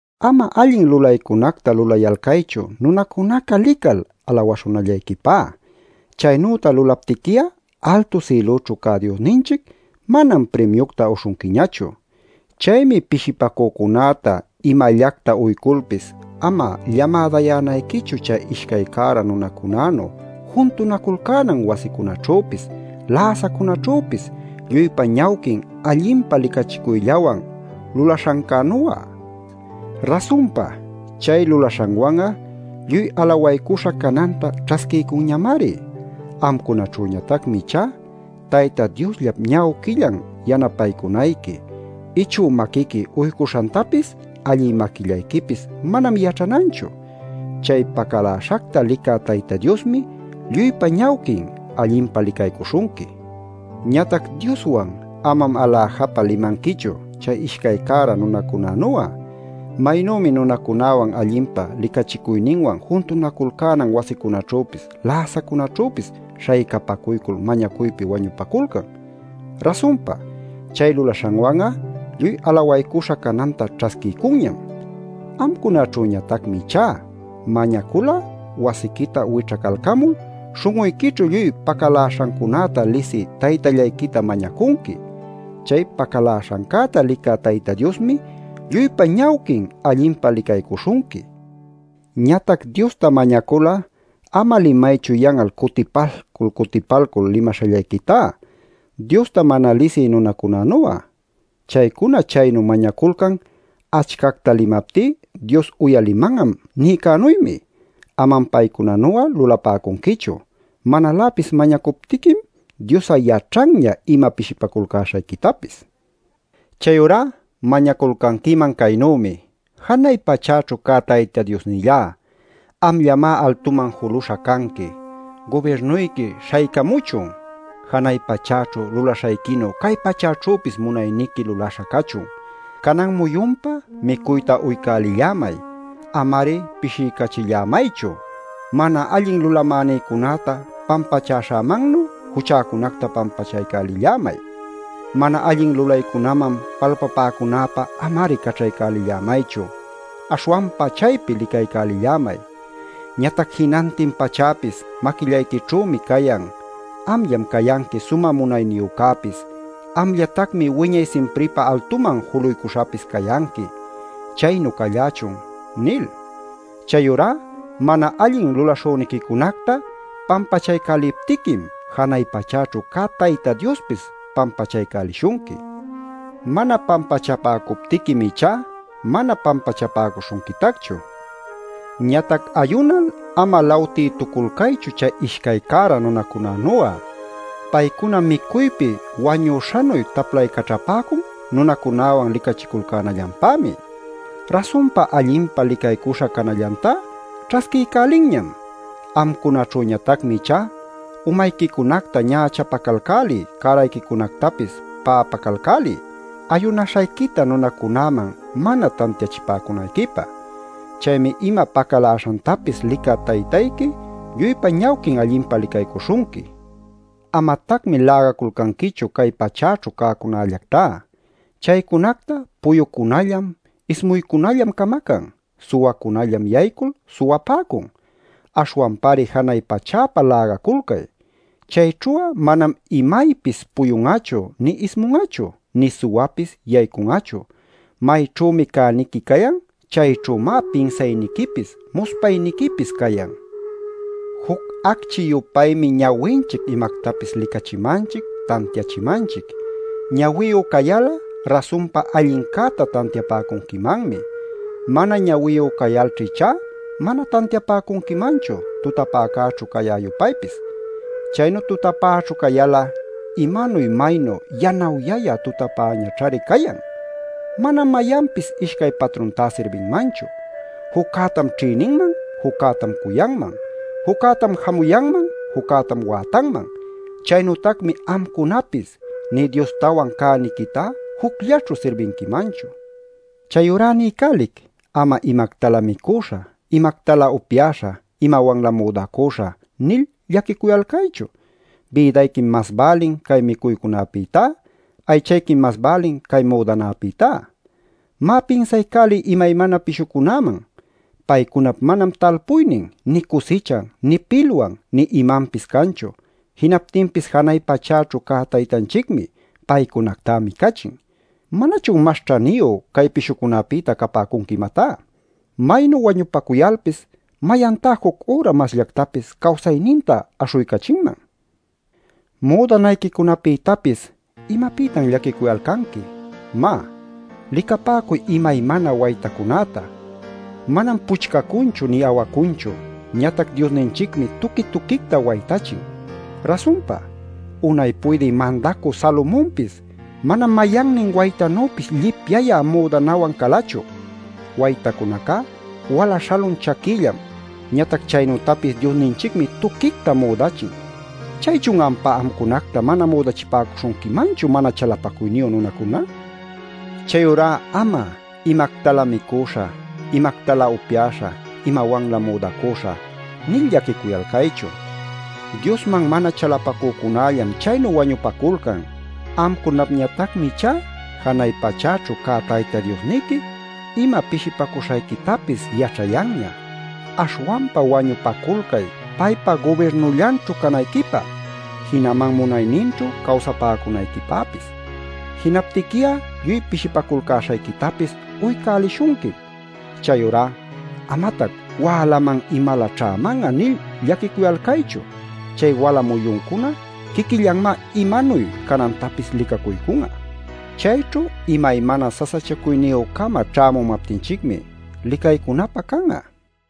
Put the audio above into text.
“Ama allin lulaycunacta lulayalcaychu nunacunaca lical alawaśhunallayquipä. Chaynüta lulaptiqui'a altu sïlućhu cä Diosninchic manam primiucta uśhunquiñachu. “Chaymi pishipacücunäta imallacta uyculpis ama llamadayänayquichu chay ishcay cära nunacunänu juntunaculcänan wasicunaćhüpis, läsacunaćhüpis lluypa ñawquin allinpa licachicuyllawan lulaśhancänu'a. Rasunpa, chay lulaśhanwan'a lluy alawaycuśha cananta ćhasquiycunñamari. Amcunaćhüñatacmi ichá, Tayta Diosllap ñawquillan yanapaycunayqui; ichü maquiqui uycuśhantapis allï maquillayquipis manam yaćhananchu. Chay pacaläśhacta licä Tayta Diosmi lluypa ñawquin allinpa licaycuśhunqui. “Ñatac Dioswan amam aläjapa limanquichu chay ishcay cära nunacunänu'a. Maynümi nunacunäwan allinpa licachicuyninwan juntunaculcänan wasicunaćhüpis läsacunaćhüpis śhaycapacuycul mañacuypi wañupaculcan. Rasunpa, chay lulaśhanwan'a lluy alawaycuśha cananta ćhasquiycunñam. Amcunaćhüñatacmi ichá, mañacul'a wasiquita wićhacalcamul śhun'uyquićhu lluy pacaläśhancunäta lisï Taytallayquita mañacunqui. Chay pacaläśhancäta licä Tayta Diosmi lluypa ñawquin allinpa licaycuśhunqui. Ñatac Diosta mañacul'a ama limaychu yan'al cutipalcul cutipalcul limaśhallayquitá, Diosta mana lisï nunacunanu'a. Chaycuna chaynu mañaculcan ‘Achcacta limaptí Dios uyaliman'am’ nïcänuymi. Amam paycunanu'a lulapäcunquichu. Manaläpis mañacuptiquim Dios'a yaćhanña ima pishipaculcäśhayquitapis. “Chayurá mañaculcanquiman caynümi: Janay pachäćhu cä Tayta Diosnillá, amllamá altuman juluśha canqui. Gubirnuyqui śhaycamuchun. Janay pachäćhu lulaśhayquinu, cay pachäćhüpis munayniqui lulaśha cachun. Canan muyunpä micuyta uycälillämay. Ama-ari pishiycachillämaychu. Mana allin lulamänïcunäta pampachäśhämannu juchäcunacta pampachaycälillämay. Mana allin lulaycunaman palpapäcunäpä ama-ari caćhaycälillämaychu. Aśhwanpa chaypi licaycälillämay. ˻Ñatac jinantin pachäpis maquillayquićhümi cayan. Amllam cayanqui sumä munayniyücäpis. Amllatacmi wiñay simpripä altuman juluycuśhapis cayanqui. Chaynu callächun˼ nil. Chayurá mana allin lulaśhüniquicunacta pampachaycäliptiquim janay pachäćhu cä Taytayqui Diospis pampachaycälishunqui. Mana pampachapäcuptiquim ichá mana pampachapäcuśhunquitacchu. “Ñatac ayunal ama lawtïtuculcaychu chay ishcay cära nunacunänu'a. Paycuna micuypi wañüśhanuy taplaycaćhapäcun nunacunawan licachiculcänallanpämi. Rasunpa allinpa licaycuśha canallantá ćhasquiycälinñam. Amcunaćhüñatacmi ichá umayquicunacta ñächapacalcäliy cärayquicunactapis pa'apacalcäliy ayunaśhayquita nunacunäman mana tantiachipäcunayquipä. Chaymi ima pacaläśhantapis licä Taytayqui lluypa ñawquin allinpa licaycuśhunqui. “Amatacmi lägaculcanquichu cay pachäćhu cäcunallactá. Chaycunacta puyucunallam ismuycunallam camacan. Suwacunallam yaycul suwapäcun. Aśhwanpari janay pachäpä lägaculcay. Chayćhu'a manam imaypis puyun'achu, nï ismun'achu, nï suwapis yaycun'achu. Mayćhümi cäniqui cayan, chayćhümá pinsayniquipis muspayniquipis cayan. “Juc acchi-yupaymi ñawinchic imactapis licachimanchic, tantiachimanchic. Ñawiyu cayal'a, rasunpa allincäta tantiapäcunquimanmi. Mana ñawiyu cayalćha ichá, mana tantiapäcunquimanchu tutapäćhu cayä-yupaypis. Chaynu tutapäćhu cayal'a ¡maynu maynu yanawyayä tutapäñaćhari cayan! “Manam mayanpis ishcay patruntá sirbinmanchu. Juccätam ćhïninman, juccätam cuyanman; juccätam jamuyanman, juccätam wätanman. Chaynütacmi amcunapis nï Diostawan cäniquita jucllaćhu sirbinquimanchu. “Chayurá niycälic: Ama ‘¿Imactalä micuśhä, imactalä upyaśhä, imawanlä müdacuśhä?’ nil llaquicuyalcaychu. Bïdayquim mas bälin cay micuycäpïtá; aychayquim mas bälin cay müdanapïtá. Má, pinsaycäliy imaymana pishucunäman. Paycunap manam talpuynin nï cusichan nï pilwan nï imanpis canchu. Jinaptinpis janay pachaćhu cä Taytanchicmi paycunactá micachin. ¿Manachun mas ćhaniyu cay pishucunapïta capäcunqui imatá? Maynu wañupacuyalpis ¿mayantá juc üra masllactapis cawsayninta aśhuycachinman? “Müdanayquicunapïtapis ¿imapïtan llaquicuyalcanqui? Má, licapäcuy imaymana waytacunäta. Manam puchcacunchu nï awacunchu. Ñatac Diosninchicmi tuqui-tuquicta waytachin. Rasunpa, unay puydï mandacü Salomonpis manam mayannin waytanüpis llipyayä müdanawan calachu. Waytacunacá wala śhalun chaquillam, ñatac chaynütapis Diosninchicmi tuquicta müdachin. ¿Chaychun ampá amcunacta mana müdachipäcuśhunquimanchu, mana chalapacuyniyu nunacuna? “Chayurá ama ‘¿Imactalä micuśhä, imactalä upyaśhä, imawanlä müdacuśhä?’ nil llaquicuyalcaychu. Diosman mana chalapacücunallam chaynu wañupaculcan. Amcunapñatacmi ichá janay pachäćhu cä Tayta Diosniqui ima pishipacuśhayquitapis yaćhayanña. Aśhwanpa wañupaculcay paypa gubirnullanćhu canayquipä, jinaman munayninćhu cawsapäcunayquipäpis. Jinaptiqui'a lluy pishipaculcäśhayquitapis uycälishunquim. Chayurá amatac ‘¿Wälaman imalä ćhäman'a?’ nil llaquicuyalcaychu. Chay wala muyuncuna quiquillanmá imanuy canantapis licacuycun'a. Chayćhu imaymana sasachacuyniyü-cama ćhämumaptinchicmi licaycunapä can'a.